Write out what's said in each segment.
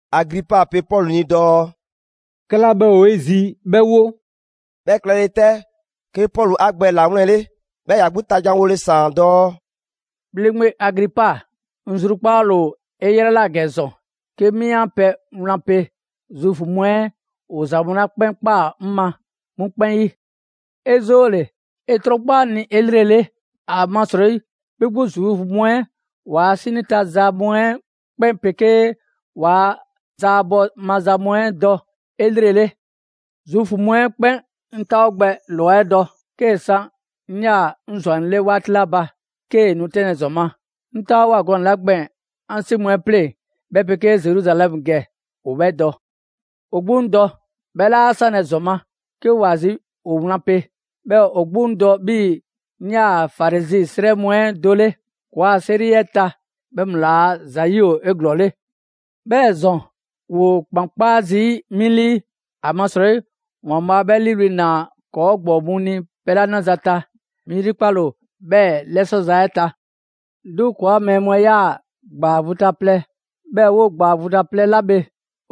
Agripa pe Pɔlu ni dɔɔ: «'Kɛla 'bhɛ ‑o 'e zi 'bhɛ 'wo.» 'Bhɛ klɛle 'tɛ, 'ke Pɔlu 'a gbɛ 'ɛ 'lawlɛnle, 'bhɛɛ‑ ‑ya 'gbu ta janwole ‑saan dɔɔ: «‑Bhleŋgbe Agripa, 'ŋ zrukpaale ‑o 'e 'yrɛ ꞊la ‑gɛ ‑zɔn, 'ke 'mi 'an pɛ wlan pe Zuufu mu 'ɛ ‑o ‑za mu 'la 'kpɛn ꞊kpaa 'ŋ ma 'mu 'kpɛn 'yi. 'E 'zoole‑ 'e 'trɔnkpa 'ŋ ni 'elrele. ‑Amasrɔyi 'bhi 'gbu Zuufu mu 'ɛ ‑waa' 'sinii ta za mu 'ɛ 'kpɛn 'pegee ‑waa' zaabɔ maza mu 'ɛ dɔ 'elrele.» «Zuufu mu 'ɛ 'kpɛn 'ŋ 'taawo gbɛ ‑lwa 'ɛ dɔ, 'kee‑ san 'ŋ 'yaa‑ 'ŋ ‑zwannɛ 'le 'waati 'la ba, 'kee‑ nu 'tɛnlɛ‑ ‑zɔn ma. 'Ŋ 'taawoa꞊ gɔnɛ‑ 'la gbɛɛn‑ 'an 'si mu 'ɛ 'pleŋ 'bhɛ 'pegee Zeruzalɛmu ‑gɛ, ‑o 'bhɛ dɔ. ‑O 'gbu 'ŋ dɔ, 'bhɛ 'laa sanlɛ‑ ‑zɔn ma, 'ke ‑wa zi ‑o wlan pe. 'Bhɛɛ‑ ‑o 'gbu 'ŋ dɔ 'bhii‑ 'ŋ 'yaa‑ Farizi 'srɛ mu 'ɛ do 'le. ‑Kɔɔa' 'seri 'ɛ ta, 'bhɛ mu ‑laa' ‑za 'yi ‑o 'eglɔɔle. 'Bhɛɛ‑ ‑zɔn, ‑woo ‑kpan 'kpaa zii' 'mi 'lii, ‑amasrɔyi ‑Waanbhaa' 'bhɛ 'liiwli‑ ‑naa ‑kɔɔ' ‑gbɔɔ mu ni pɛ 'la 'naza‑ ta, 'mi 'yrikpale ‑o 'bhɛɛ‑ 'lɛsɔ‑ za 'ɛ ta. 'Duŋ‑ ‑kɔɔa' mɛɛ mu 'ɛ 'yaa‑ ‑gbaa vu ta plɛ, 'bhɛɛ‑ 'woo‑ ‑gbaa vu ta plɛ 'la bhe,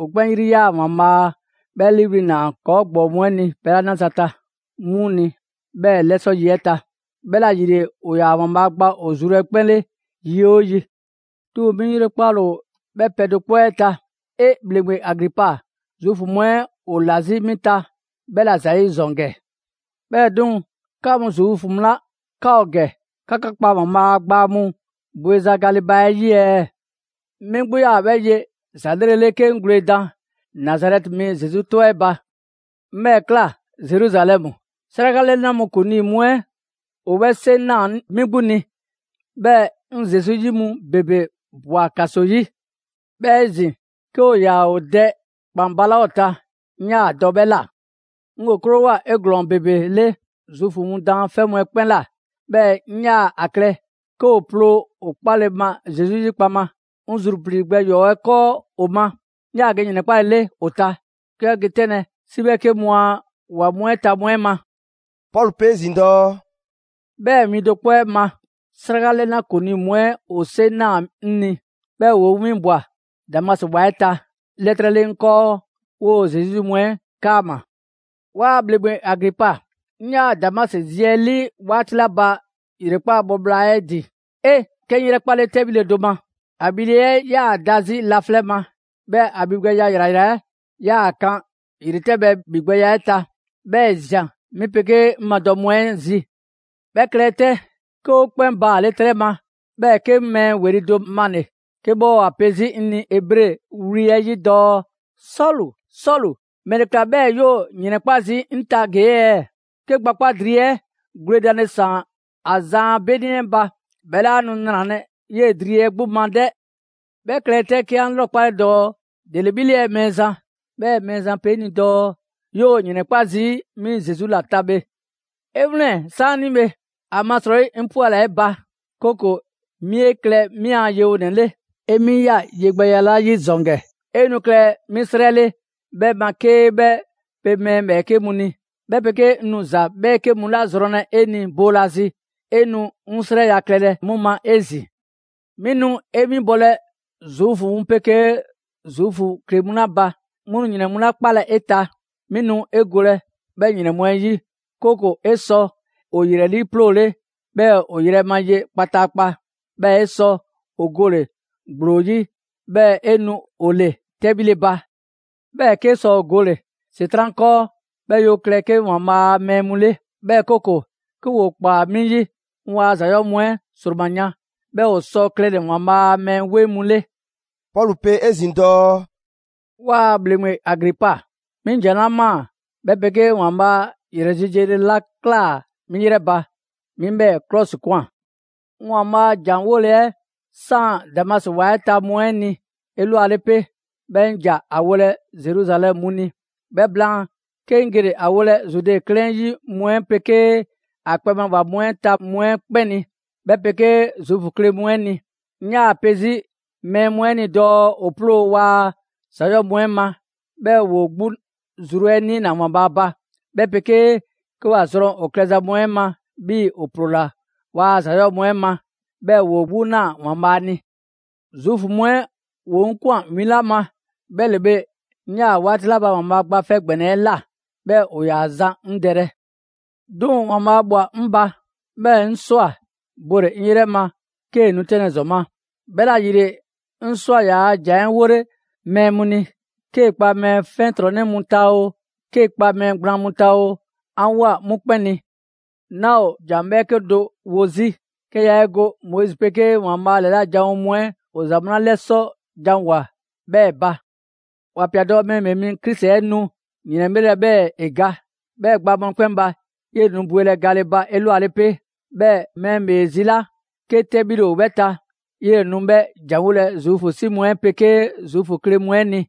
‑o 'kpɛn 'yri ꞊yaa ‑Waanbhaa' 'bhɛ 'liiwli‑ ‑naa ‑kɔɔ' ‑gbɔɔ mu 'ɛ ni pɛ 'la 'naza‑ ta 'mu ni 'bhɛ 'lɛsɔ yi 'ɛ ta. 'Bhɛla‑ ‑yile ‑o ‑yaa ‑Waanbhaa' gba ‑o zru 'ɛ 'kpɛn 'le yi 'oo yi. 'Duŋ‑ 'mi 'yrikpale ‑o 'bhɛ pɛ do 'kpɔ 'ɛ ta. 'E! ‑Bhleŋgbe Agripa, Zuufu mu 'ɛ ‑o ‑la 'zi 'mi 'ta 'bhɛla‑ ‑zayi' ‑zɔn ‑gɛ! 'Bhɛɛ‑ 'duŋ‑, 'ka mu Zuufu mu 'la 'ka ‑o ‑gɛ, 'ka 'ka kpa ‑Waanbhaa' a gbaa mu bweza gale ba 'ɛ 'yi ɛɛ? 'Mi 'gbu 'yaa‑ 'bhɛ ye ‑za 'lrelele 'ke 'ŋ gwledan Nazarɛti mi Zesu 'tɔ 'ɛ ba. 'Ŋ 'bhɛɛ‑ ꞊kla Zeruzalɛmu. 'Sraka 'lɛna mu ‑kuŋlii mu 'ɛ ‑o 'bhɛ 'seŋ ꞊naa 'mi 'gbu ni, 'bhɛɛ‑ 'ŋ Zesu 'yi mu ‑bebe ꞊bwa ‑kaso 'yi. 'Bhɛɛ‑ 'ezin‑ 'ke ‑o ‑yaa ‑o dɛ ‑kpan balaa' ‑o ta, 'ŋ 'yaa‑ dɔ 'bhɛ ꞊la. 'Ŋ ‑o 'krowoa‑ 'eglɔɔn‑ ‑bebele Zuufu mu daanfɛ' mu 'ɛ 'kpɛn ꞊la; 'bhɛɛ‑ 'ŋ 'yaa‑ ‑a klɛ 'ke ‑o 'ploo‑ ‑o 'kpale‑ ma Zesu 'yi kpaŋma. 'Ŋ zruplii‑ gbɛ ‑yɔɔ' 'ɛ 'kɔɔ ‑o ma, 'ŋ 'yaa‑ ge ‑yrɛnkpalele ‑o ta, 'ke 'bhɛ ge 'tɛnlɛ‑ 'si 'bhɛɛke mu a ‑wa mu 'ɛ ta mu 'ɛ ma.» Pɔlu pe 'ezin‑ dɔɔ: «'Bhɛɛ‑ win do 'kpɔ 'ɛ ma,'sraka 'lɛna ‑kuŋlii mu 'ɛ ‑o 'seŋ ꞊naa 'ŋ ni, 'bhɛɛ‑ ‑woo 'ŋ 'winbwa‑ Damasi ‑wa 'ɛ ta, 'lɛtrɛ 'le 'ŋ 'kɔɔ 'woo‑ Zesu 'yi mu 'ɛ 'kaama‑. 'Waa ‑Bhleŋgbe Agripa, 'ŋ 'yaa‑ Damasi zi 'ɛ 'lii 'waati 'la ba ‑yrekpaa' bhɔ bhla 'e ‑din. 'E! 'Ke 'ŋ 'yrɛkpale 'tɛbhile do ma. ‑A ‑bhile' 'ɛ 'yaa‑ da 'zi laflɛ' ma, 'bhɛɛ‑ ‑a ‑bhi gbɛya ‑yrayra 'ɛ 'yaa‑ kan ‑yretɛbhɛ ‑bhigbɛya 'ɛ ta; 'bhɛɛ‑ ‑e ‑zian 'mi 'pegee 'ŋ madɔ mu 'ɛ zi. 'Bhɛ klɛle 'tɛ, 'ke 'o 'kpɛn baale' 'trɛ ma, 'bhɛɛ‑ 'ke 'ŋ mɛɛ ‑weli' do male‑ 'ke 'bhɛ ‑a pe 'zi 'ŋ ni Ebre wli 'ɛ 'yi dɔɔ: ‹Sɔlu, Sɔlu, ‑mɛle ꞊kla 'bhɛɛ‑ 'yoo‑ ‑yrɛnkpa' zii' 'ŋ ta ‑gee' ɛɛ? 'Ke gbakpa' dri 'ɛ gwledanle ‑saan ‑a zan a 'beni 'ɛ ba, 'bhɛ 'laa nu ‑nralɛ' 'yee‑ dri 'ɛ 'gbu ma 'dɛ!› 'Bhɛ klɛle 'tɛ, 'ke 'an 'lrɔkpale dɔɔ: ‹‑Dele 'bhi 'le ɛɛ Mɛɛzan?› 'Bhɛɛ‑ Mɛɛzan pe 'ŋ ni dɔɔ: ‹'Yoo‑ ‑yrɛnkpa' zii' 'mi Zesu ‑la ta bhe. 'E 'wlɛn‑ 'saanibhe! ‑Amasrɔyi 'ŋ 'pwɛla‑ 'e ba, 'kooko‑ 'mi 'e klɛ 'mi 'an yewonɛ 'le. 'E 'mi ꞊ya yegbɛya 'la 'yi ‑zɔn ‑gɛ, 'e nu klɛlɛ 'mi 'srɛ 'le 'bhɛ ma 'kee 'bhɛ pe mɛɛ ‑bhɛɛke' mu ni; 'bhɛ 'pegee 'ŋ nu ‑za 'bhɛɛke mu 'la zrɔnlɛ 'e ni boolazi, 'e nu 'ŋ 'srɛya‑ klɛlɛ 'mu ma 'ezin‑. 'Mi nu 'e 'winbɔlɛ Zuufu mu 'pegee Zuufu kle mu 'la ba, 'mu nu ‑yrɛn mu 'la 'kpalɛ‑ 'e ta, 'mi nu 'e golɛ 'bhɛ ‑yrɛn mu 'ɛ 'yi, 'kooko‑ 'e sɔ ‑o ‑yrɛ 'liiploole, 'bhɛɛ‑ ‑o yrɛ ma ye kpataakpa, 'bhɛɛ‑ 'e sɔ ‑o gole‑ ‑gblo 'yi, 'bhɛɛ‑ 'e nu ‑o ‑le 'tɛbhile ba; 'bhɛɛ‑ 'kee sɔ ‑o gole‑ ‑Setran' 'kɔɔ 'bhɛɛ‑ 'yoo‑ klɛ 'ke ‑Waanbhaa' a mɛɛ mu 'le. 'Bhɛɛ‑ 'kooko‑ 'ke ‑woo ꞊kpaa 'mi 'yi, 'ŋ ‑waa' ‑za 'yɔɔ‑ mu 'ɛ ‑sroma yan, 'bhɛɛ‑ ‑o sɔ klɛle‑ ‑Waanbhaa' a mɛɛ 'weŋ mu 'le.›» Pɔlu pe 'ezin‑ dɔɔ: «'Waa‑ ‑Bhleŋgbe Agripa, 'mi ‑jan 'la ꞊maa 'bhɛ 'pegee ‑Waanbhaa' ‑yrɛ zi yele 'la ꞊klaa 'mi 'yrɛ ba, 'mi 'bhɛɛ‑ 'klɔsikwan. 'Ŋ ‑Waanbhaa' a ‑jan 'wole‑ 'ɛ ‑saan Damasi ‑wa 'ɛ ta mu 'ɛ ni 'elwale 'pe, 'bhɛɛ‑ 'ŋ ‑ja ‑a wolɛ Zeruzalɛmu mu ni. 'Bhɛ blaan, 'ke 'ŋ gele‑ ‑a wolɛ Zude 'klɛɛn 'yi mu 'ɛ 'pegee ‑a kpɛ ma ‑wa mu 'ɛ ta mu 'ɛ 'kpɛn ni, 'bhɛ 'pegee Zuufu kle mu 'ɛ ni. 'Ŋ 'yaa‑ pe 'zi mɛɛ mu 'ɛ ni dɔɔ ‑o 'ploo‑ waa ‑za ‑yɔɔ' mu 'ɛ ma, 'bhɛɛ‑ ‑woo 'gbu zru 'ɛ 'niina‑ ‑Waanbhaa' ba, 'bhɛ 'pegee 'ke ‑wa zrɔn ‑o klɛza mu 'ɛ ma 'bhii‑ ‑o ‑ploola ‑waa' ‑za 'yɔɔ‑ mu 'ɛ ma, 'bhɛɛ‑ ‑woo 'gbu ꞊naa ‑Waanbhaa' ni. Zuufu mu 'ɛ ‑woo 'ŋ ꞊kwan win 'la ma, 'bhɛ ‑le bhe, 'ŋ 'yaa‑ 'waati 'la ba ‑Waanbhaa' Gba 'Fɛ ‑Gbɛnɛ 'ɛ ꞊la, 'bhɛɛ‑ ‑o ‑yaa zan 'ŋ dɛlɛ. 'Duŋ‑ ‑Waanbhaa' ꞊bhwa 'ŋ ba, 'bhɛɛ‑ 'ŋ ꞊swa bole 'ŋ 'yrɛ ma 'kee‑ nu 'tɛnlɛ‑ ‑zɔn ma. 'Bhɛla‑ ‑yile, 'ŋ ꞊swa ‑yaa' ‑jan 'ɛ 'wole mɛɛ mu ni: 'kee‑ 'kpa mɛɛ 'fiɛntrɔnnɛ mu ta oo, 'kee‑ 'kpa mɛɛ gblaan mu ta oo, 'an ꞊woa 'mu 'kpɛn ni. 'Naa‑ ‑o ‑jan 'bhɛɛke do wo 'zi, 'ke yaa 'e go Moizi 'pegee ‑Waanbhaa' ‑lɛla' janwo mu 'ɛ ‑o ‑za mu 'la 'lɛsɔ janwoa‑ 'bhɛɛ‑ ba. ‑Wa ꞊pia dɔɔ: ‹Mɛɛ ‑Bhee Mi Krisi 'ɛ nu ‑yrɛnbhlelɛ 'bhɛɛ‑ ‑e ga. 'Bhɛɛ‑ gbaa mu 'ɛ 'kpɛn ba, 'yele‑ nu bwelɛ gale ba 'elwale 'pe; 'bhɛɛ‑ mɛɛ ‑bhee zi 'la 'ke 'tɛbhile ‑o 'bhɛ ta, 'yele‑ nu 'bhɛ a janwolɛ Zuufu 'si mu 'ɛ 'pegee Zuufu kle mu 'ɛ ni.›»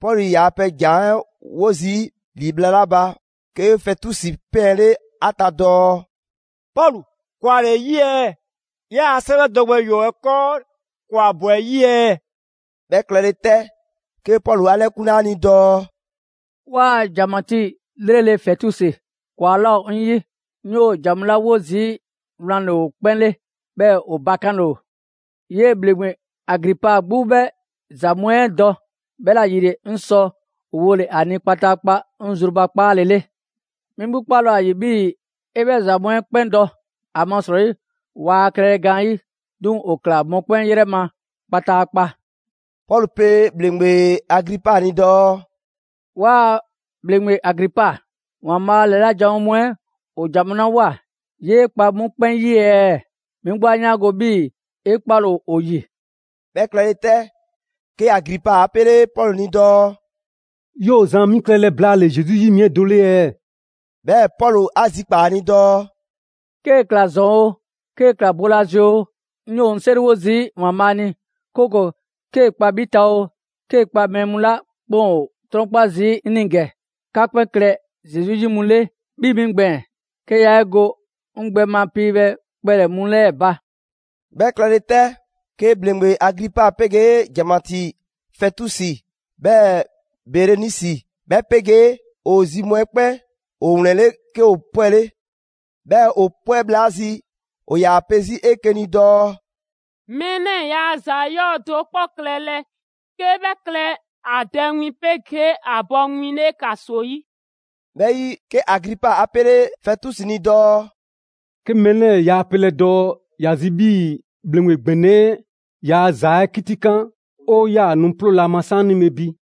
Pɔlu ‑yaa 'bhɛ ‑jan 'ɛ 'wo zii' ‑li bhla 'la ba, 'ke Fɛtusi 'pɛɛnle ‑a ta dɔɔ: «Pɔlu, ‑kwa ‑le 'e 'yi ɛɛ? 'Yaa‑ 'sɛwɛ dɔ gbɛ ‑yɔɔ' 'ɛ 'kɔɔ, ‑kwa ꞊bwa 'ɛ 'yi ɛɛ!» 'Bhɛ klɛle 'tɛ, 'ke Pɔlu 'a 'lɛkunle ‑a ni dɔɔ: «'Waa‑ ‑janmatii 'lrele‑ Fɛtusi, ‑kwa 'laa ‑o 'ŋ 'yi. 'Ŋ 'yoo‑ ‑jan mu 'la 'wo zii' wlan ‑le ‑o 'kpɛn 'le, 'bhɛɛ‑ ‑o bakanle ‑o. 'Yee‑ ‑Bhleŋgbe Agripa 'gbu 'bhɛ ‑za mu 'ɛ dɔ, 'bhɛla‑ ‑yile 'ŋ sɔ ‑o wole‑ ‑a ni kpataakpa 'ŋ zrubakpaale 'le. 'Mi 'gbu 'kpale‑ ‑o ‑a ‑yi 'bhii‑ ‑e 'bhɛ ‑za mu 'ɛ 'kpɛn dɔ, ‑amasrɔyi waa klɛlɛ gaanyi'; 'duŋ‑ ‑o ꞊kla mɔkpɛn' 'yrɛ ma kpataakpa.» Pɔlu pe ‑bhleŋgbe Agripa ni dɔɔ: «'Waa‑ ‑Bhleŋgbe Agripa, ‑Waanbhaa' ‑lɛla' janwo mu 'ɛ ‑o ‑jan mu 'la ꞊woa, 'yee kpa 'mu 'kpɛn 'yi ɛɛ? 'Mi 'gbu 'a 'yaango‑ 'bhii‑ 'e 'kpale‑ ‑o ‑o ‑yi!» 'Bhɛ klɛle 'tɛ, 'ke Agripa 'a 'pele Pɔlu ni dɔɔ: «'Yoo‑ zan 'mi klɛlɛ blaale‑ Zesu 'yi mi 'ɛ do 'le ɛɛ?» 'Bhɛɛ‑ Pɔlu 'a zikpaa‑ ‑a ni dɔɔ: «'Kee‑ ‑kla ‑zɔn oo, 'kee‑ ‑kla boolazi oo, 'ŋ 'yoo‑ 'ŋ 'seriwo zii' ‑Waanbhaa' ni 'kooko‑ 'kee‑ kpa 'bhi ta oo, 'kee kpa mɛɛ mu 'la 'kpɛn ‑o 'trɔnkpa zii' 'ŋ ni ‑gɛ, 'ka 'kpɛn klɛ Zesu 'yi mu 'le 'bhii‑ 'mi gbɛɛn‑; 'ke yaa 'e go 'ŋ gbɛ ma piibhɛ kpɛlɛ‑ mu 'lɛɛ ba.» 'Bhɛ klɛle 'tɛ, 'ke ‑bhleŋgbe Agripa 'pegee ‑janmatii Fɛtusi 'bhɛɛ‑ Berenisi, 'bhɛ 'pegee ‑o zi mu 'ɛ 'kpɛn ‑o ‑wlɛnle', 'ke ‑o 'pwɛle. 'Bhɛɛ‑ ‑o 'pwɛ bhla 'ɛ zi ‑o ‑yaa pe 'zi 'eke‑ ni dɔɔ: «Mɛɛ 'lɛɛ‑ ‑yaa ‑za 'yɔɔ‑ do 'kpɔ klɛlɛ 'ke 'bhɛ klɛ ‑a dɛ win 'pegee ‑a bɔ win 'le ‑kaso 'yi.» 'Bhɛ 'yi, 'ke Agripa 'a 'pele Fɛtusi ni dɔɔ: «'Ke mɛɛ 'lɛɛ‑ yaa pelɛ dɔɔ ‑ya zi 'bhii‑ ‑bhleŋgbe ‑gbɛnɛ 'ɛ ‑yaa' ‑za 'ɛ 'kitikan, 'o 'yaa‑ nu 'ploolɛ‑ ‑a ma 'saanibhe bi.»